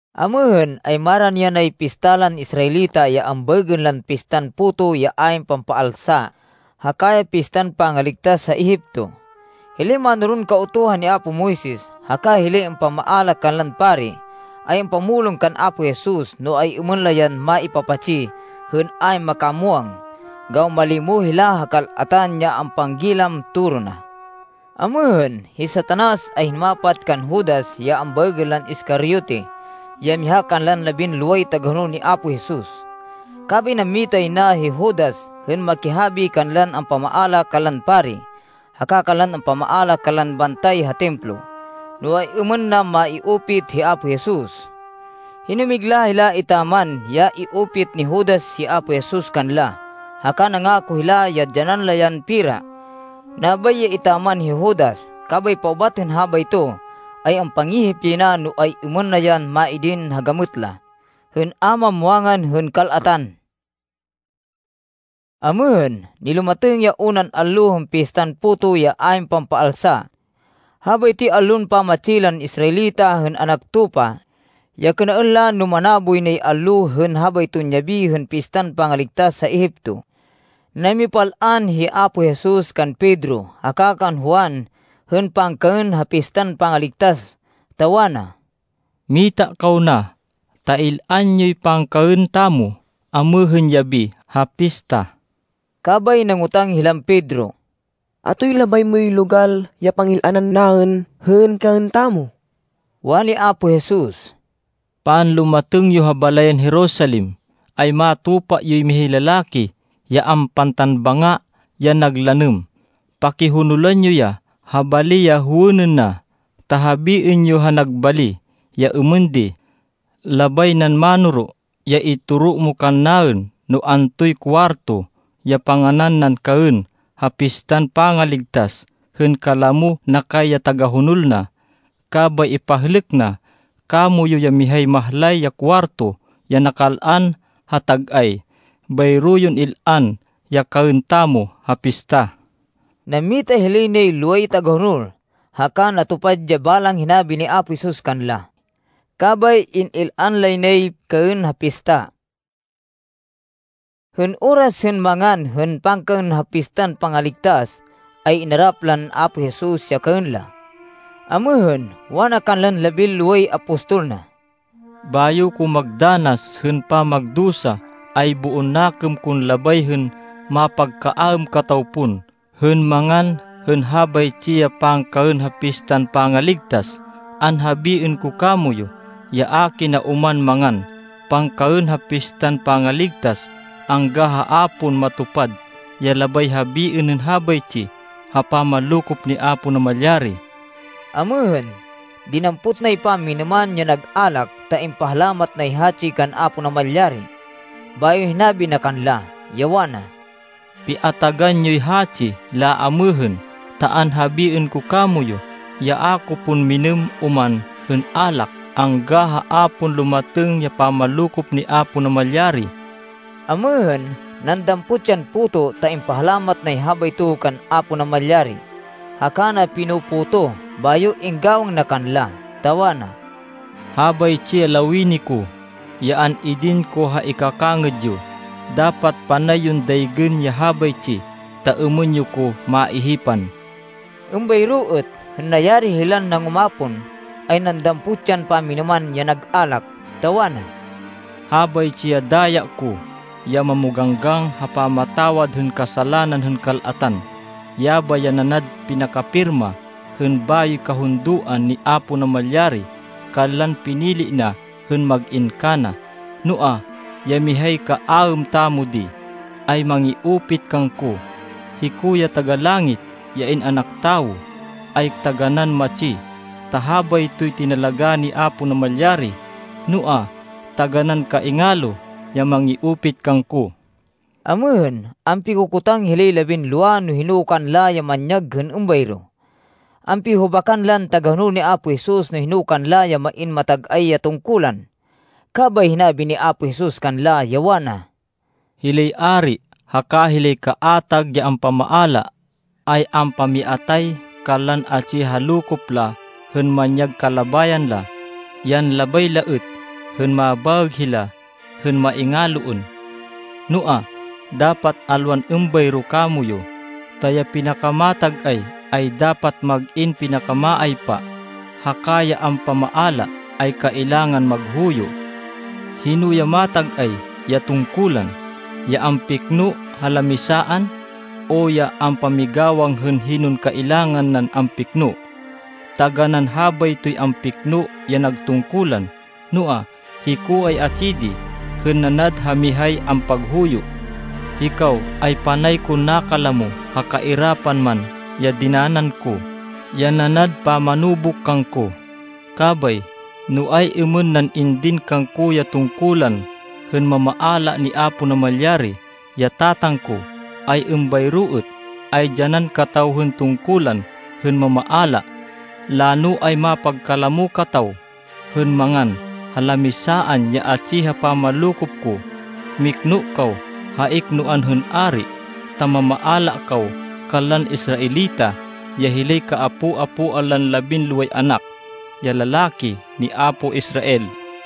Amêhên, ay marani yanay pista lan Israelita ya ambaêgên lan Pistan Puto ya ayn Pampaalsa haka ya Pistan Pangaligtas ha Egipto. Hilay mánoron Kautuhan ni apo Moises, haka hilay ampamaala kanlan pari, ay ampamulong kan Apo Jesus, no ay-êmên la yan maipapatsi hên ayn makamwang, gawan malimo hila ha kal-atan, ya ampanggilam toro na. Amêhên, hi Satanas ay hinumapat kan Judas, ya ambaêgên lan Iscariote, ya miha kanlan labinloway tagahonol ni Apo Jesus. Kabay nammita yay na hi Judas hên makihabi kanlan ampamaala kanlan pari haka kanlan ampamaala kanlan bantay ha Templo, no ay-êmên na mai-upit hi Apo Jesus. Hinumigla hila etaman ya i-upit ni Judas hi Apo Jesus kanla, haka nangako hila ya dyanan la yan pera. Nabay ya etaman hi Judas, kabay paubat hên habayto, ay ampangihip yay na no ay-êmên na yan maidin ha gamêt la, hên a mamwangan hên kal-atan. Amêhên, nilumatêng ya unan allo hên Pistan Puto ya ayn Pampaalsa. Habaytoy allon pamatsi lan Israelita hên anak tupa, ya kênaên la no manaboy nay allo hên habayton yabi hên Pistan Pangaligtas ha Egipto. Namipal-an hi Apo Jesus kan Pedro haka kan Juan hên pangkaên ha Pistan Pangaligtas, ta wana, “Mita kaw na, ta il-an yoy pangkaên tamo amêhên yabi ha pista.” Kabay nangotang hilan Pedro, “Atoy labay moy logal ya pangil-anan naên hên kaên tamo?” Wani Apo Jesus, “Panlumatêng yo ha balayan Jerusalem, ay matupa yoy mihay lalaki ya ampantan banga ya nag lanêm. Pakihonolan yo ya ha bali ya howênên na, ta habiên yo ha nag bali, ya êmên di, ‘Labay nan Mánoro ya itoro mo kannaên, no antoy kuwarto ya panganan nan kaên ha Pistan Pangaligtas, hên kalamo na kay ya tagahonol na.’ Kabay ipahlêk na kamoyu ya mihay mahlay ya kuwarto ya nakal-an ha tag-ay. Bayro yon il-an ya kaên tamo ha pista.” Nammita hilay nay loway tagahonol, haka natupad ya balang hinabi ni Apo Jesus kanla. Kabay in-il-an lay nay kaên ha pista. Hên oras hên mangan hên pangkaên ha Pistan Pangaligtas, ay inarap lan Apo Jesus ya kaên la. Amêhên, wana kanlan labinloway apostol na, “Bayo ko magdanas hên pamagdusa, ay boon nakêm kon labay hên mapagkaêm kataw pon hên mangan hên habaytsi ya pangkaên ha Pistan Pangaligtas. Anhabiên ko kamoyu, ya a kina oman mangan pangkaên ha Pistan Pangaligtas angga ha a pon matupad ya labay habiên hên habaytsi ha pamanlokop ni Apo Namalyari.” Amêhên, dinampot nay pamminêman ya nag alak ta impahalamat nay hatsi kan Apo Namalyari, bayo hinabi na kanla, ya wana, “Piatagan yoy hatsi laamêhên. Ta anhabiên ko kamoyu, ya a ko pon minêm oman hên alak, angga ha a pon lumatêng ya pamanlokop ni Apo Namalyari.” Amêhên, nandampot yan puto ta impahalamat nay habayto kan Apo Namalyari, haka na pino-potoh, bayo inggawang na kanla, ta wana, “Habaytsi ya lawini ko, ya an-idin ko ha ikakangêd yo. Dapat panay yon daygên ya habaytsi, ta êmên yo ko maihipan.” Êmbayro êt, hên nayari hilan nangumapon, ay nandampot yan pamminêman ya nag alak, ta wana, “Habaytsi ya daya ko, ya mamoganggang ha pamatawad hên kasalanan hên kal-atan. Yabay ya nanad pinakapirma hên bayoy kahundoan ni Apo Namalyari kanlan pinili na hên mag-in kana. “Noa, ya mihay kaaêm tamo di, ay mangi-upit kangko. Hiko ya Taga-Langit, ya In-anak Tawo ay taganán matsi, ta habaytoy tinalagá ni Apo Namalyari. Noa, taganán kaingalo ya mangi-upit kangko.” Amêhên, ampikokotang hilay labinlowa no hino kanla ya manyag hên êmbayro. Ampihuhubakan lan tagahonol ni Apo Jesus no hino kanla ya main matag-ay ya tungkulan. Kabay hinabi ni Apo Jesus kanla, ya wana, “Hilay ari haka hilay kaatag ya ampamaala, ay ampamiatay kanlan atsi ha lokop la hên manyag kalabayan la, yan labay la êt hên mabaêg hila hên maingaloên. Noa, dapat alwan êmbayro kamoyu, ta ya pinakamatag-ay, ay dapat mag-in pinakamaaypa. Haka ya ampamaala, ay kailangan maghuyo. Hino ya matag-ay ya tungkulan? Ya ampikno ha lamisaan, o ya ampamigawang hên hinon kailangan nan ampikno? Taganán habaytoy ampikno ya nag tungkulan! Noa, hiko ay atsi di hên nanad ha mihay ampaghuyo. “Hikaw ay panay kon nakalamo, ha kairapan man ya dinanan ko, ya nanad pamanubuk kangko. Kabay, no ay-êmên nan indin kangko ya tungkulan hên mamaala, ni Apo Namalyari, ya Tatang ko, ay êmbayro êt ay dyanan kataw hên tungkulan hên mamaala. Lano ay mapagkalamo kataw hên mangan ha lamisaan ya atsi ha pamanlokop ko. Mikno kaw ha iknoan hên ari ta mamaala kaw kanlan Israelita, ya hilay kaapo-apoan lan labinloway anak ya lalaki ni apo Israel.”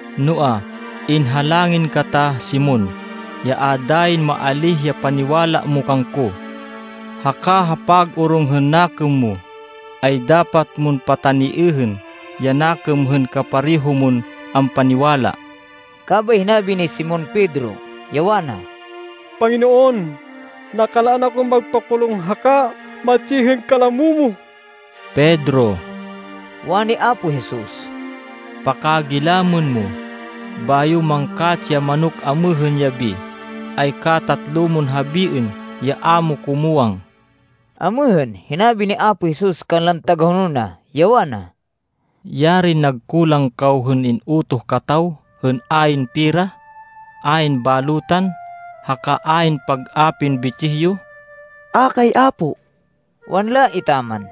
Noa, inhalangin kata Simon, ya a dayin maalíh ya paniwala mo kangko. Haka ha pag-orong hên nakêm mo ay dapat mon pataniêhên ya nakêm hên kapareho mon ampaniwala.” Kabay hinabi ni Simon Pedro, ya wana, “Panginoon, nakal-an akon magpakulung haka matsi hên kalamo mo.” “Pedro,” wani Apo Jesus, “pakagilamên mo, bayo mangkatsi ya manok amêhên yabi, ay katatlo mon habiên ya a mo ko muwang.” Amêhên, hinabi ni Apo Jesus kanlan tagahonol na, ya wana, “Yarin nagkulang kaw hên in-utoh kataw hên ayn pera, ayn balutan, haka ayn pag-apin bitsih yo!” “A kay, Apo,” wanla etaman.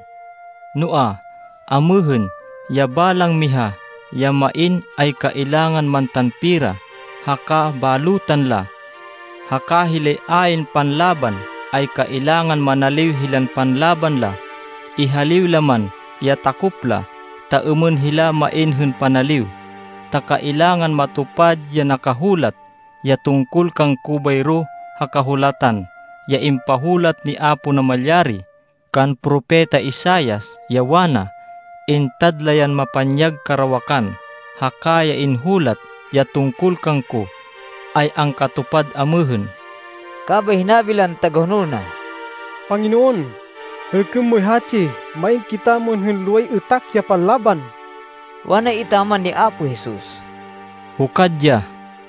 “Noa, amêhên, ya balang miha ya main, ay kailangan mantan pera haka balutan la. Haka hilay ayn panlaban ay kailangan manaliw hilan panlaban la, ihaliw la man ya takop la, ta êmên hila main hên panaliw. Ta kailangan matupad ya nakahulat ya tungkol kangko bayro ha Kahulatan ya impahulat ni Apo Namalyari kan Propeta Isaias, ya wana, ‘Intad la yan mapanyag karawakan.’ Haka ya inhulat ya tungkol kangko ay angkatupad amêhên.” Kabay hinabi lan tagahonol na, “Panginoon, hêlkên moy hatsi. Main kitamo hên loway êtak ya panlaban.” Wana etaman ni Apo Jesus, “Hukad ya.”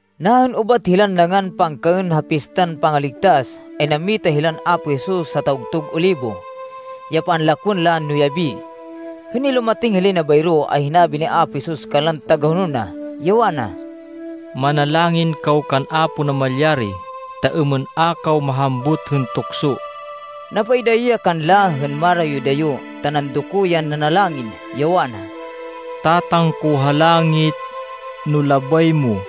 Nahên ubat hilan nangan pangkaên ha Pistan Pangaligtas, ay nammita hilan Apo Jesus ha Tawgtug Olibo, ya panlakwên la no yabi. Hên nilumatêng hilay na bayro, ay hinabi ni Apo Jesus kanlan tagahonol na, ya wana, “Manalangin kaw kan Apo Namalyari, ta êmên a kaw mahambut hên tukso.” Napaidayo ya kanla hên marayo-dayo ta nandoko yan nanalangin, ya wana, “Tatang ko ha langit, no labay mo,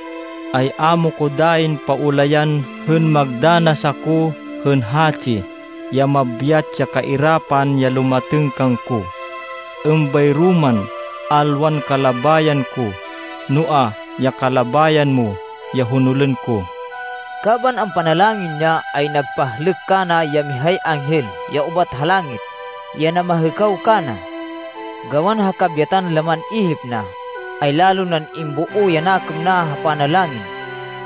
ay a mo ko dayin paulayan hên magdanas ako hên hatsi ya mabyat ya kairapan ya lumatêng kangko. Êmbayro man, alwan kalabayan ko, noa, ya kalabayan mo ya honolên ko.” Kaban ampanalangin ya ay nagpahlêk kana ya mihay anghel, ya ubat ha langit, ya namahêkaw kana. Gawan ha kabyatan laman ihip na, ay lalo nan imboo ya nakêm na ha panalangin,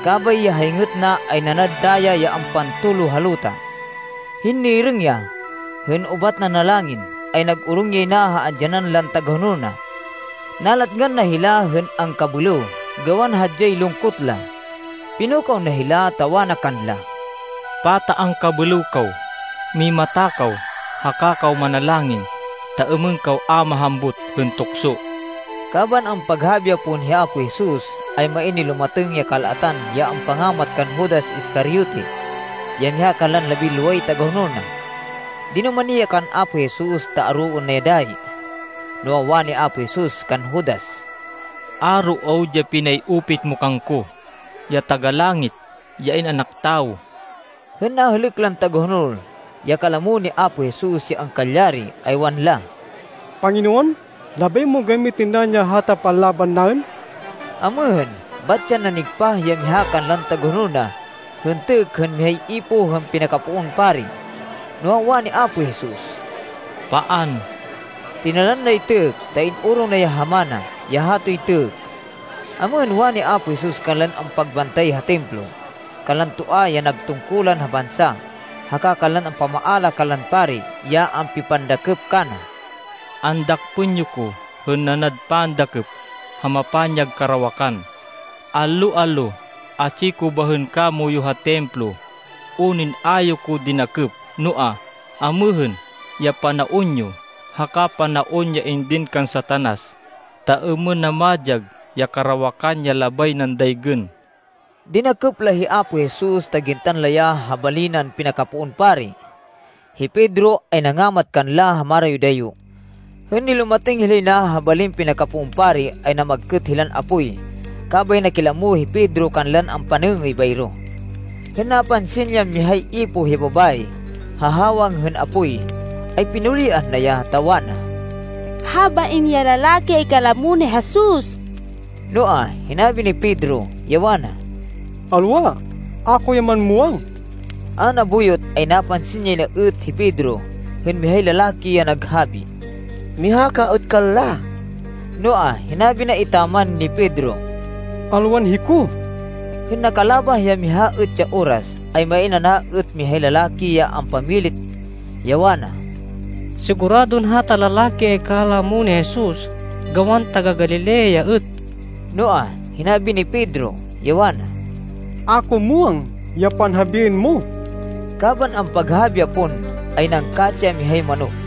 kabay ya hayngêt na, ay nanad daya ya ampantolo ha luta. Hên nirêng ya, hên ubat nanalangin, ay nag-orong yay na ha andyanan lan tagahonol na. Nalatngan na hila hên angkabêlêw gawan hadyay lungkot la. Pinukaw na hila, ta wana kanla, “Pata angkabêlêw kaw? Mimata kaw, haka kaw manalangin ta êmên kaw a mahambut hên tukso.” Kaban ampaghabi ya pon hi Apo Jesus, ay main nilumatêng ya kal-atan, ya ampangamat kan Judas Iscariote ya miha kanlan labinloway tagahonol na. Dinumani ya kan Apo Jesus ta aroên na ya dayi. Noa, wani Apo Jesus kan Judas, “Aro awud ya pinay-upit mo kangko, ya Taga-Langit, ya In-anak Tawo.” Hên nahêlêk lan tagahonol, ya kalamo ni Apo Jesus, ya angkalyari, ay wanla, “Panginoon, labay mon gamitên naên ya hata panlaban naên?” Amêhên, bat yan nanigpah ya miha kanlan tagahonol na hên têkk hên mihay ipoh hên pinakapoon pari. Noa, wani Apo Jesus, “Paan!” Tinalan nay têkk, ta in-orong na ya ha mana, ya hatoy têkk. Amêhên, wani Apo Jesus kanlan ampagbantay ha Templo, kanlan toa ya nag tungkulan ha bansa, haka kanlan ampamaala kanlan pari, ya ampipandakêp kana, “Andakpên yo ko hên nanad pandakêp ha mapanyag karawakan. Allo-allo atsi ko bahên kamoyu ha Templo, unin a yo ko dinakêp. Noa, amêhên ya panaon yo, haka panaon ya indin kan Satanas, ta êmên na madyag ya karawakan ya labay nan daygên.” Dinakêp la hi Apo Jesus ta gintan la ya ha bali nan pinakapoon pari. Hi Pedro ay nangamat kanla ha marayo-dayo. Hên nilumatêng hilay na ha balin pinakapoon pari ay namagkêt hilan apoy, kabay nakilamo hi Pedro kanlan ampanêngêy bayro. Hên napansin yan mihay ipoh ya babayi, ha hawang hên apoy, ay pinuliah na ya, ta wana, “Habain ya lalaki ay kalamo ni Jesus.” Noa, hinabi ni Pedro, ya wana, “Alwa. A ko ya man muwang.” A nabuyot ay napansin yay na êt hi Pedro, hên mihay lalaki, ya naghabi, “Miha ka êt kanla!” Noa, hinabi na etaman ni Pedro, “Alwan hiko.” Hên nakalabah ya miha êt ya oras, ay main ana êt mihay lalaki ya ampamilit, ya wana, “Siguradon hata lalaki ay kalamo ni Jesus gawan taga-Galilea ya êt.” Noa, hinabi ni Pedro, ya wana, “A ko muwang ya panhabiên mo!” Kaban ampaghabi ya pon, ay nangkatsi ya mihay manok.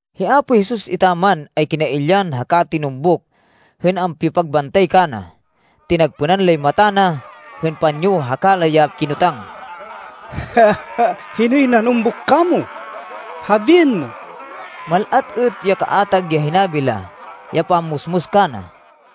Hi Apo Jesus etaman ay kinailyan haka tinumbuk hên ampipagbantay kana. Tinagpênan lay mata na hên panyo haka la ya kinotang, “Hinoy nanumbuk kamo? Habiên mo!” Mal-at êt ya kaatag ya hinabi la, ya pammusmus kana.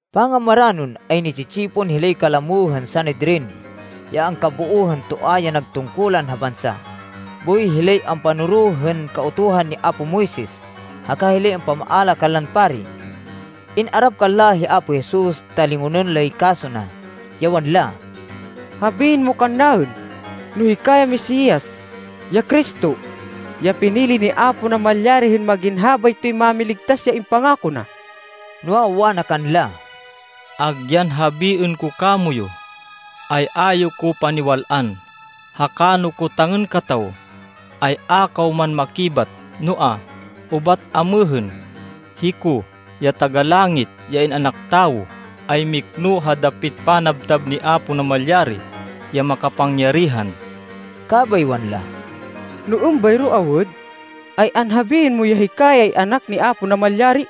Pangamaranon, ay ni-tsi-tsipon hilay kalamo hên Sanedrin, ya angkaboo hên toa ya nag tungkulan ha bansa, boy hilay ampanoro hên Kautuhan ni apo Moises, haka hilay ampamaala kanlan pari. In-arap kanla hi Apo Jesus ta lingonên lay kaso na, ya wanla, “Habiên mo kannaên no hika ya Mesias, ya Cristo, ya pinili ni Apo Namalyari hên mag-in habaytoy Mámiligtas ya impangako na.” Noa, wana kanla, “Agyan habiên ko kamoyu, ay a yo ko paniwal-an. Haka no kotangên kataw, ay a kaw man makibat. Noa, ubat amêhên, hiko, ya Taga-Langit ya In-anak Tawo, ay mikno ha dapit panabtab ni Apo Namalyari ya Makapangyarihan.” Kabay wanla, “No êmbayro awud, ay anhabiên mo ya hika ay Anak ni Apo Namalyari.”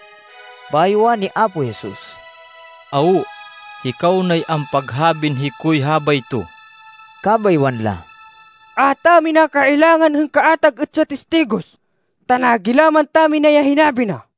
Bayo wani Apo Jesus, “Awo, hikaw nay ampaghabin hikoy habayto.” Kabay wanla, “A tamina kailangan hên kaatag êt ya tistigos, ta nagilaman tamina ya hinabi na.”